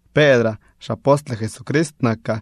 Pedraa, xapostle Jesucrist nakaa.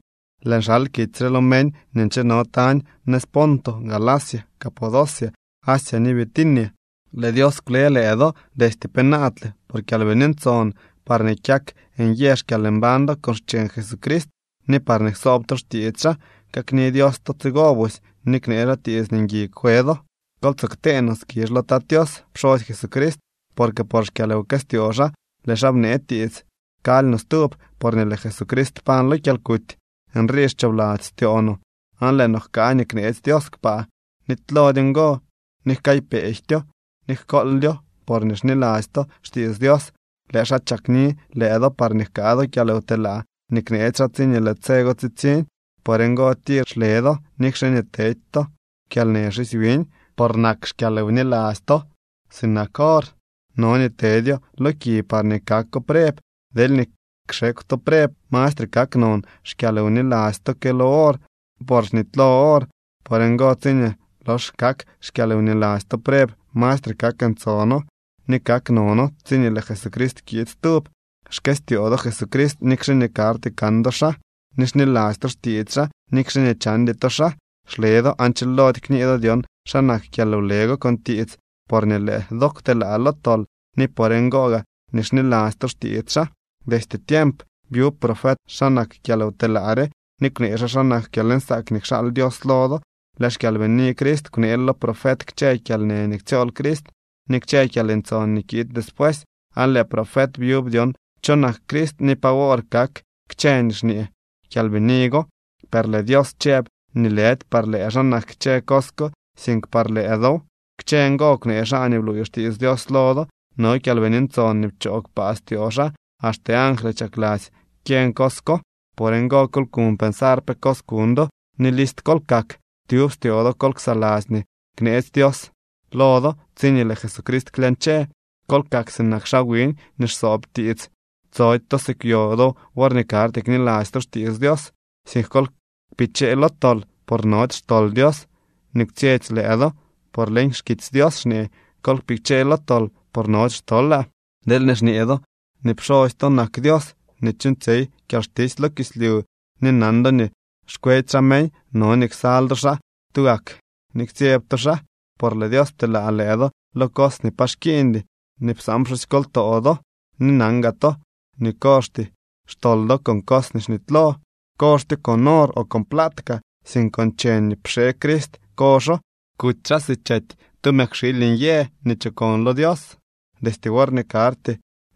Lëën xal kitsy re lo meñ nii ncheno tañ nëz Ponto, Galacia, Capadocia, Asia ni Bitinia. Lëë Dios kwle lëë do destye penaadle por Kyalbini Ntson parñee kyak nyë xkyalmbañ do con xcheñ Jesucrist ni parñee ksoob to xtiits xaa. Kakni Dios to tsigo busy ni knee xaa tiits nii ngui kwe do. Kol tsoo ktee no skizh lo Tat Tios pxosy Jesucrist, porque por xkyalwkëstyoo xaa lëë xaa bnee tiits kaly no stub porñee lëë Jesucrist pañ lo kyalkuty. Nrii xchoobladzy styoo no aan lëë no jkaa nii kneetsy Dios kpaa. Nitylody ngo ni jkaaypejtyo ni jkooldyo. Porñee xniladzy to xtiits Dios lëë xaa chakni lëë do parñee jkaa do kyalwtelaa nii kneetsy xaa tsiñee lëë tse go tsitsiñ. Por ngo tir xle do, nikxe nii tedy to kyalnë xisy wiñ. Por nak xkyalwniladzy to sinak or. No nii tedyo lo ki parñee kako preb. Deelñee kxekw to preb, mastre kak non xkyalwniladzy to que lo or, por xnitylo or. Por ngo, tsiñee lox kak xkyalwniladzy to preb, mastre kak ntsono ni kak nono tsiñee lëë Jesucrist kiid stub. Xkëstyoo do Jesucrist nikxe nii karty kan do xaa ni xniladzy to xtiits xaa nikxe nii chandy to xaa. Xle do aan chilody kñee do dyon xa nak kyalwle go con tiits, porñee lëë do kwtelaa lo tol, ni por ngo gaa nii xniladzy to xtiits xaa. Destye tiemp byub profet xa nak kyalwtelaa re ni kwnee xaa xa nak kyalnsaak nii kxaal Dios lo do. Lëë xKyalbini Crist kwneel lo profet kchë kyalnë nii ktsyool Crist ni kchë kyalntson nii kiid despuesy, aan lëë profet byub dyon cho nak Crist ni pa wor kak kchë nii xñee Kyalbini go. Per lëë Dios chëb nii lëdy par lëë xaa nak kchë cos ko, sink par lëë dow. Kchë ngo kwnee xaa nii bluuy xtiits Dios lo do. No Kyalbini Ntson nii pchoo kpaa styoo xaa. Axte angly chakladzy kyeñ cos ko. Por ngo, kol kuñ pensar pe cos kuñ do ni list kol kak. Tyub styoo do kol ksaladzy nii kneetsy Dios lo do tsiñee lëë Jesucrist klyañche. Kol kak sinak xaa wiñ nii xsoob tiits. Tsody to si kwyo do worñee karty kniladzy to xtiits Dios, sink kol kpichee lo tol, por nody xtol Dios nii kwtsyetsy lëë do. Por leñ xkitsy Dios xñee: “Kol kpichee lo tol, por nody xtolaa.” Deelñee xñee do nii pxosy to nak Dios nii chuuñtsyey kyalxtisy lo kislyu ni nan do nii xkwedy xaa meñ, no nii ksal do xaa tugak ni ktsyeb to xaa. Por lëë Dios pteelaa lëë do lo cos nii pa xkiiñdy nii psaan pxusykoltoo do, ni nan gaa to nii kozhty xtol do con cos nii xnitylo. Kozhtyo con or o plaat kaa, sink con cheñ nii pxee Crist kozho. Kuty xaa si chety tu mëkwxiily nyë nii chokon lo Dios. Destye worñee karty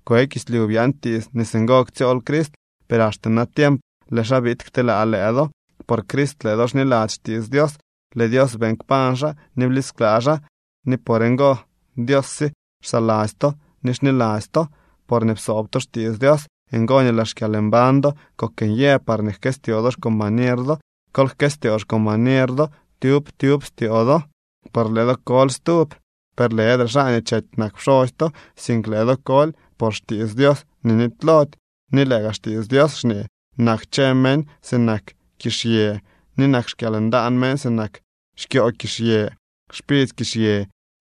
kwe kislyu byaan tiits nii singo ktsyool Crist, per axte natiemp lëë xaa biid kteelaa lëë do. Por Crist lëë do xniladzy xtiits Dios. Lëë Dios beeñ kpañ xaa ni blisklaa xaa, ni por ngo, Dios sye xsaladzy to ni xniladzy to. Porñee psoob to xtiits Dios, ngo nii lëë xkyalmbañ do kok nyë parñee jkëstyoo do xcombañer do. Kol jkëstyoo xcombañer do tyub tyub styoo do. Por lëë do koly stub, per lëdre xaa nii chety nak pxosy to, sink lëë do koly por xtiits Dios nii nitylody. Ni lëë gaa Xtiits Dios xñee: Nak kchë meñ sinak kizhyë, ni nak xkyalndaan meñ sinak xkyoo kizhyë. Xpidzy kizhyë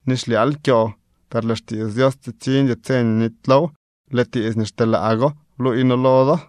ni xlyaal kyoo, per lëë xtiits Dios, tsitsiñdy tse nii nitylow. Lëë tiits nii xteelaa go bluuy noo lo do.